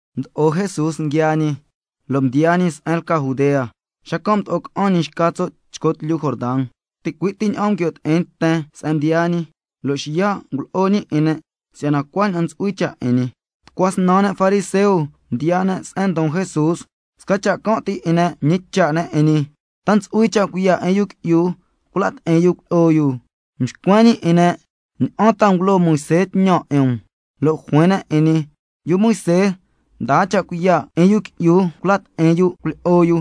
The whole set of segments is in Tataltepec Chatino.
Mdo'o Jesús nguiaa ñi, lo' mdiyaa ñi se'en lca Judea, xacan' mdo'o ca'an ñi xca tso' chco tlyu Jordan. Ticui' ti ña'an nguio' ti'in nten se'en mdiyaa ñi, lo' xiya' ngulo'o ñi 'in ne' si'yana cuaña'an ntsu'hui cha' 'in ñi. Tucua snan ne' fariseo mdiyaa ne' se'en ndon Jesús, sca cha' can' ti 'in ne' mñicha' ne' 'in ñi: ¿Ta ntsu'hui cha' cuiya' 'in yu qui'yu cula' ti'in yu cuilyi'o yu? Mxcuen ñi 'in ne': ¿Ña'an ta ngulo Moisé tñan 'in um? Lo' juin ne' 'in ñi: Yu Moisé mdaa cha' cuiya' 'in yu qui'yu cula' ti'in yu cuilyi'o yu,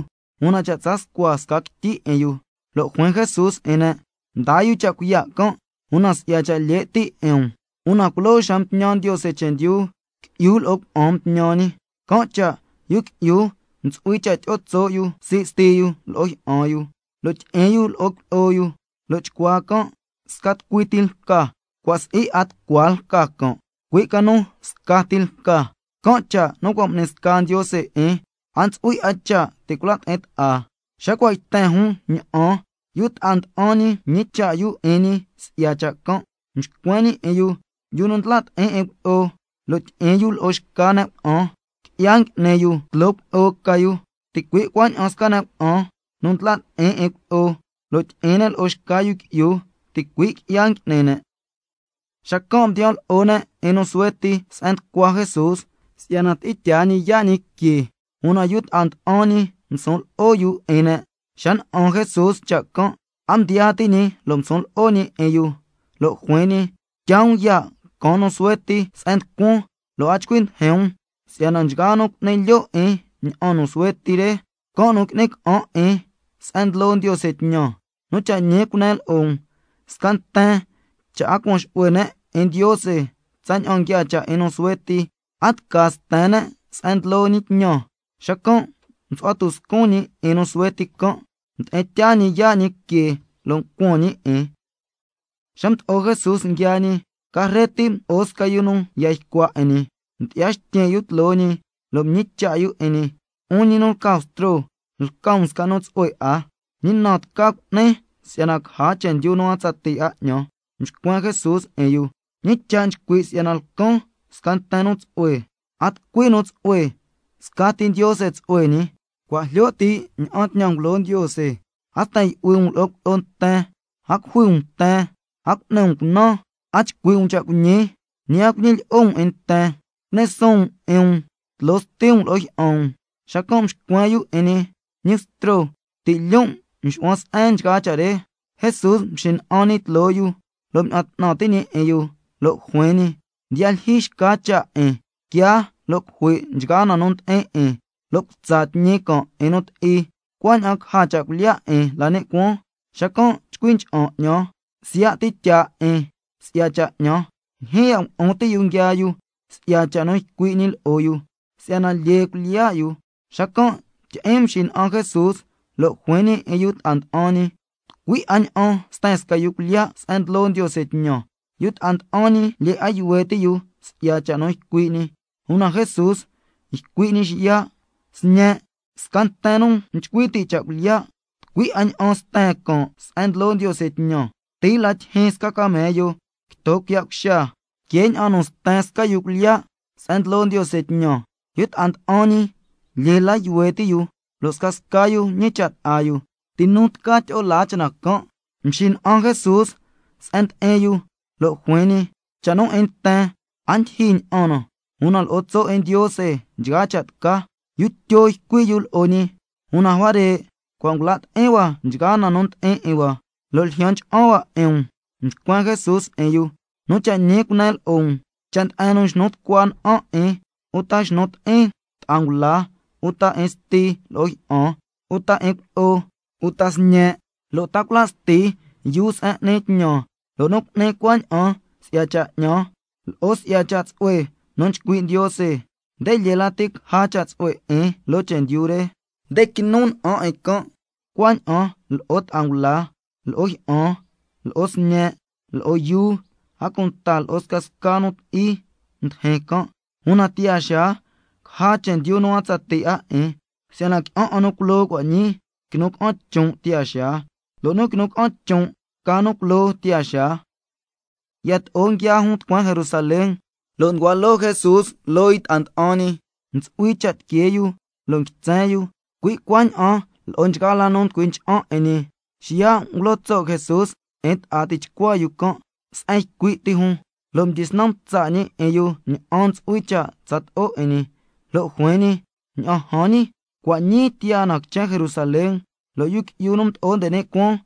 una cha' tsa' scua sca quityi 'in yu. Lo' juin Jesús 'in ne': Mdaa yu cha' cuiya' can', una si'ya cha' lye' ti' 'in um. Una culoo xa mtñan Ndiose chendyu, —qui'yu lo' cuna'an mtñan ñi. Can' cha' yu qui'yu ntsu'hui cha' tyi'o tso' yu sii' sti yu lo'o jyi'an yu, lo' tyi'in yu lo'o cuilyi'o yu, lo' chcuaa can' sca tucui ti lca—, cua' si'i 'a tucua lca can', cui' ca nu scati lca. Can' cha' nu cua' m'ni sca Ndiose 'in, a ntsu'hui 'a cha' ti' cula' ti'in ta'a. Xa cua' mdiyaa jun ña'an, yu ta'a nda'an ñi mñicha' yu 'in ñi si'ya cha' can'. Mxcuen ñi 'in yu: Yu nu ndla' ti'in 'in cuilyi'o, lo' tyi'in yu lo'o xca ne' cuna'an, qui'ya ngui'ni yu tloo cuilyi'o ca yu. Ticui' cuaña'an sca ne' cuna'an nu ndla' ti'in 'in cuilyi'o, lo' tyi'in ne' lo'o xca yu qui'yu, ticui' qui'ya ngui'ni ne'. Xacan' mdiyan lo'o ne' 'in nu suhue ti se'en nducua Jesús, si'yana tyi'in tyaa ñi yaa' ñi que, una yu ta'a nda'an ñi ngusun lo'o yu 'in ne'. Xa na'an Jesús cha' can', a mdyaa ti' ñi lo' ngusun lo'o ñi 'in yu, lo' juin ñi: Tyaa um ya' caan nu suhue ti se'en nducuan, lo' a chcui ndijin um, si'yana nchgaa nu cu'ni lyo' 'in ña'an nu suhue ti re, can' nu qui'ni ca'an 'in se'en ndlo Ndiose tñan. Nu cha' ñi cunen lo'o um: Sca nten cha' a cuan xu'hue ne' 'in Ndiose tsaña'an nguiaa cha' 'in nu suhue ti, a tca sten ne' se'en ndlo ñi tñan. Xacan' msu'hua tuscun ñi 'in nu suhue ti can', mdi'in tyaa ñi yaa' ñi que, lo' ncuan ñi 'in. Xa mdo'o Jesús nguiaa ñi, carre ti mdo'o sca yu nu yan ycua 'in ñi, mdyi'ya xtyin' yu tloo ñi, lo' mñicha' yu 'in ñi: 'Un ñi nu lca Bstro, lca um sca nu tsu'hue 'a, ¿ñi na tca cu'nin si'yana caja chendyu nu a tsatii 'a 'ñan? Mxcuen Jesús 'in yu: ¿Ñi cha' nchcui' si'yana lcan sca nten nu tsu'hue? A tucui nu tsu'hue, scati Ndiose tsu'hue ñi. Cua' jlyo ti' ña'an tñan ngulo Ndiose: —A sten yu'hui um lo'o cuilyi'o nten, a cujui um nten, a cu'ni um cunan, a chcui' um cha' cuiñi—, ñi a cuñilyi'o um nten, —cu'ni suun um 'in um tloo sti um lo'o jyi'an um—. Xacan' mxcuen yu 'in ñi: Ñi Bstro, ti' lyon' nxu'huan se'en nchgaa cha' re. Jesús mxina'an ñi tloo yu lo' mña'an 'tnan ti' ñi 'in yu, lo' juin ñi: Ndiyaa lyijyi xca cha' 'in, quiaa lo' cujui' nchgaa na nu ndi'in 'in lo' cutsa tñi can' 'in nu ti'i, cuaña'an caja cha' cuilyiya' 'in la ni' cuaan, xacan' chcui ncha'an 'ñan, siya' ti tyaa 'in si'ya cha' 'ñan. Ndyijyin ya' ngulu'un ti' yu nguiaa yu si'ya cha' nu ycui' ñi lo'o yu, si'yana lyee cuilyiya' yu. Xacan' tyi'iin mxina'an Jesús, lo' juin ñi 'in yu ta'a nda'an ñi: Tucui 'a ña'an sten sca yu cuilyiya' se'en ndlo Ndiose tñan. Yu ta'a nda'an ñi lyee 'a yuhue ti' yu si'ya cha' nu ycui' ñi, una Jesús ycui' ñi xiya': Sñen', sca nten nu nchcui ti' cha' cuilyiya', tucui 'a ña'an sten can' se'en ndlo Ndiose tñan. Cuti la tyijyin sca camello quito quiya' cuxa, que ña'an nu sten sca yu cuilyiya' se'en ndlo Ndiose tñan. Yu ta'a nda'an ñi lyee la yuhue ti' yu, lo' scasca yu ñicha' ta'a yu: ¿Ti nu tca tyi'o laa cha' na can'? Mxina'an Jesús se'en ndi'in yu, lo' juin ñi: Cha' nu 'in nten, a ndyijyi ña'an na, una lo'o tso' 'in Ndiose nchgaa cha' tca. Yu Tyo mdyisnan ycui' yu lo'o ñi: Una huare' cua' ngula' ti'in hua nchgaa na nu ndi'in 'in hua, lo' ljyan ncha'an hua 'in um. Mxcuen Jesús 'in yu: Nu cha' ñi cunen lo'o um, cha' nde'en nu xnu tucua na'an 'in, uta xnu ti'in ta'a ngula, uta 'in sti lo'o jyi'an, uta 'in cuilyi'o, uta sñe', lo' ta cula' sti yuu se'en n'ni tñan, lo' nu cu'ni cuaña'an si'ya cha' 'ñan, lo'o si'ya cha' tsu'hue nu nchcui' Ndiose, nde lyee lati caja cha' tsu'hue 'in loo chendyu re: Nde quinu na'an 'in can', cuaña'an lo'o ta'a ngula, lo'o jyi'an, lo'o sñe', lo'o yuu, a cunta lo'o scasca nu ti'i tyijyin can', una tiyaa xaa caja chendyu nu a tsatii 'a 'in. Si'yana qui'an 'a nu culoo cua' ñii, quinu ca'an chon' tiyaa xaa, lo' nu nguinu ca'an chon', ca nu culoo tiyaa xaa. Yato'o nguiaa jun tucueen Jerusalén, lo' nducua loo Jesús loo yu ta'a nda'an ñi, ntsu'hui cha' tiquee yu, a cunta nguitsen yu, cui' cuaña'an lo'o nchgaa la ña'an nu nchcui ncha'an 'in ñi. Xiya' ngulo tso' Jesús 'in ta'a tichcua yu can' se'en ycui' ti jun, lo' mdyisnan mtsa' ñi 'in yu ña'an ntsu'hui cha' tsato'o 'in ñi. Lo' juin ñi: Ña'an jan ñi, cua' ñii tiyaa na quichen Jerusalén, lo' Yu Qui'yu nu Mdo'o nde ni' Cuaan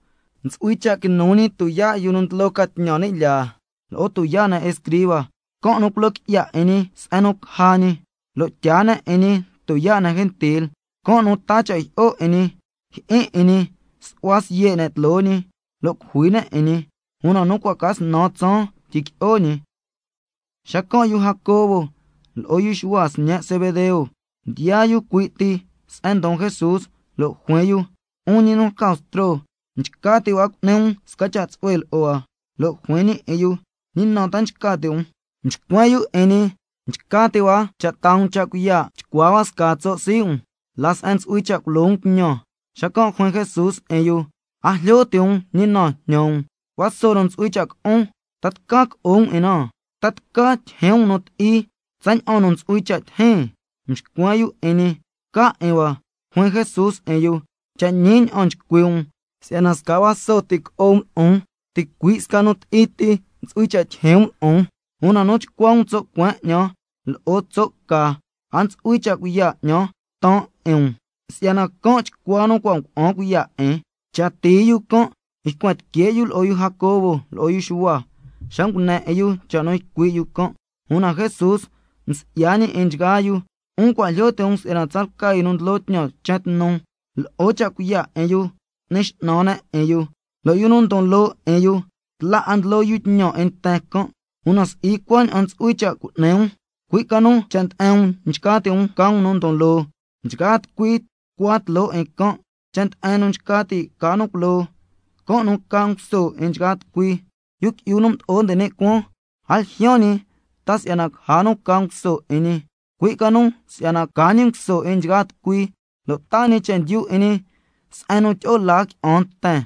ntsu'hui cha' quinu ñi tuyaa' yu nu ndlo ca tñan ni' lyaa, lo'o tuyaa' ne' escriba, can' nu culo qui'ya 'in ñi se'en nu caja ñi, lo' tyaa ne' 'in ñi tuyaa' ne' gentil. Can' nu taa cha' jyi'o 'in ñi, jyi'in 'in ñi, su'hua siye' ne' tloo ñi, lo' cujui ne' 'in ñi, una nu cua' ca snan tsaan tyiqui'o ñi. Xacan' yu Jacobo lo'o yu Xuhua, sñe' Zebedeo, mdiyaa yu cui' ti se'en ndon Jesús, lo' juin yu: 'Un ñi nu lca Bstro, nchca ti' hua cu'ni um sca cha' tsu'hue lo'o hua. Lo' juin ñi 'in yu: ¿Ñi na ta nchca ti' um? Mxcuen yu 'in ñi: Nchca ti' hua cha' taa um cha' cuiya' chcua hua scaa tso' sii' um la se'en ntsu'hui cha' culo um tñan. Xacan' juin Jesús 'in yu: A jlyo ti' um ñi na jñan um. Vaso nu ntsu'hui cha' co'on, ¿ta tca co'o um 'in na? ¿Ta tca tyijyin um nu ti'i tsaña'an nu ntsu'hui cha' tijin? Mxcuen yu 'in ñi: Tca 'in hua. Juin Jesús 'in yu: Cha' ñi ña'an nchcui' um si'yana sca vaso ti co'o um lo'on, ticui' sca nu ti'i ti ntsu'hui cha' tyijyin um lo'on. Una nu chcua um tso' cueen 'ñan lo'o tso' ca, a ntsu'hui cha' cuiya' 'ñan taan 'in um, si'yana can' chcua nu cua' ngua'an cuiya' 'in. Cha tii yu can' ycuen tique' yu lo'o yu Jacobo lo'o yu Xuhua, xa ngune 'in yu cha' nu ycui' yu can'. Una Jesús msi'ya ñi 'in nchgaa yu: 'Un cua' jlyo ti' um si'yana tsalca yu nu ndlo tñan quichen tnu, lo'o cha' cuiya' 'in yu n'ni x'nan ne' 'in yu, lo' yu nu ndon loo 'in yu, tla 'a ndlo yu tñan 'in nten can'. Una si'i cuaña'an ntsu'hui cha' cu'ni um, cui' ca nu cha' nde'en um nchca ti' um ca um nu ndon loo lati, can' nu tucua tloo nchgaa tucui. Cha' nde'en nu nchca ti' ca nu culoo, can' nu ca nguso 'in nchgaa tucui. Yu Qui'yu nu Mdo'o nde ni' Cuaan, a ljyaan ñi ta si'yana caja nu ca nguso 'in ñi, cui' ca nu si'yana ca ñi nguso 'in nchgaa tucui, lo' taa ñi chendyu 'in ñi si'yana tyi'o laa qui'an nten.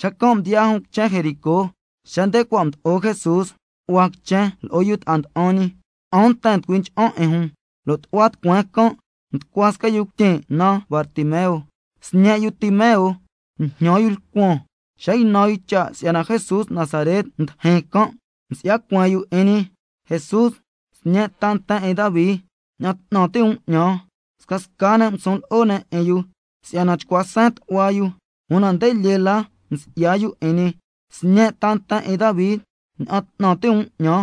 Xacan' mdiyaa jun quichen Jericó. Xa nde cua' mdo'o Jesús tu'hua quichen lo'o yu ta'a nda'an ñi, qui'an nten nducui ncha'an 'in jun, lo' tu'hua tucueen can' nducua sca yu cuityin' naan Bartimeo, sñe' yu Timeo, njñan yu lcuan. Xa ynan yu cha' si'yana Jesús Nazaret ndijin can', xacan' msi'ya cueen yu 'in ñi: Jesús, Sñe' ta nten 'in Davi, ña'an 'tnan ti' um 'ñan. Scasca ne' ngusun lo'o ne' 'in yu si'yana chcua seen tu'hua yu, una nde lyee la msi'ya yu 'in ñi: Sñe' ta nten 'in Davi, ña'an 'tnan ti' um 'ñan.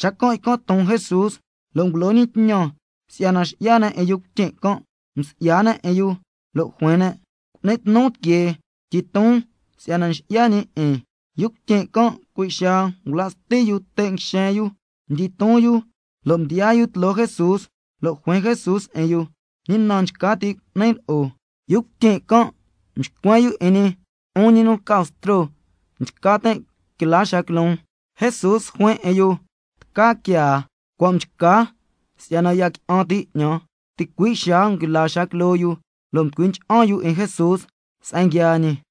Xacan' ycan' ton Jesús, lo' ngulo ñi tñan si'yana xi'ya ne' 'in yu cuityin' can'. Msi'ya ne' 'in yu, lo' juin ne': Cu'ni tnu tiquee, tyiton si'yana nxi'ya ñi 'in. Yu cuityin' can' cui' xaa ngula' sti yu te' nguixen yu, mdyiton yu, lo' mdiyaa yu tloo Jesús. Lo' juin Jesús 'in yu: ¿Ñi na nchca ti' cu'nin lo'o? Yu cuityin' can' mxcuen yu 'in ñi: 'Un ñi nu lca Bstro, nchca tin' quila xaa quiloon. Jesús juin 'in yu: Tca quiaa, cua' mchca si'yana ya qui'an ti' 'ñan. Ticui' xaa nguila xaa quiloo yu, lo' mducui ncha'an yu 'in Jesús se'en nguiaa ñi.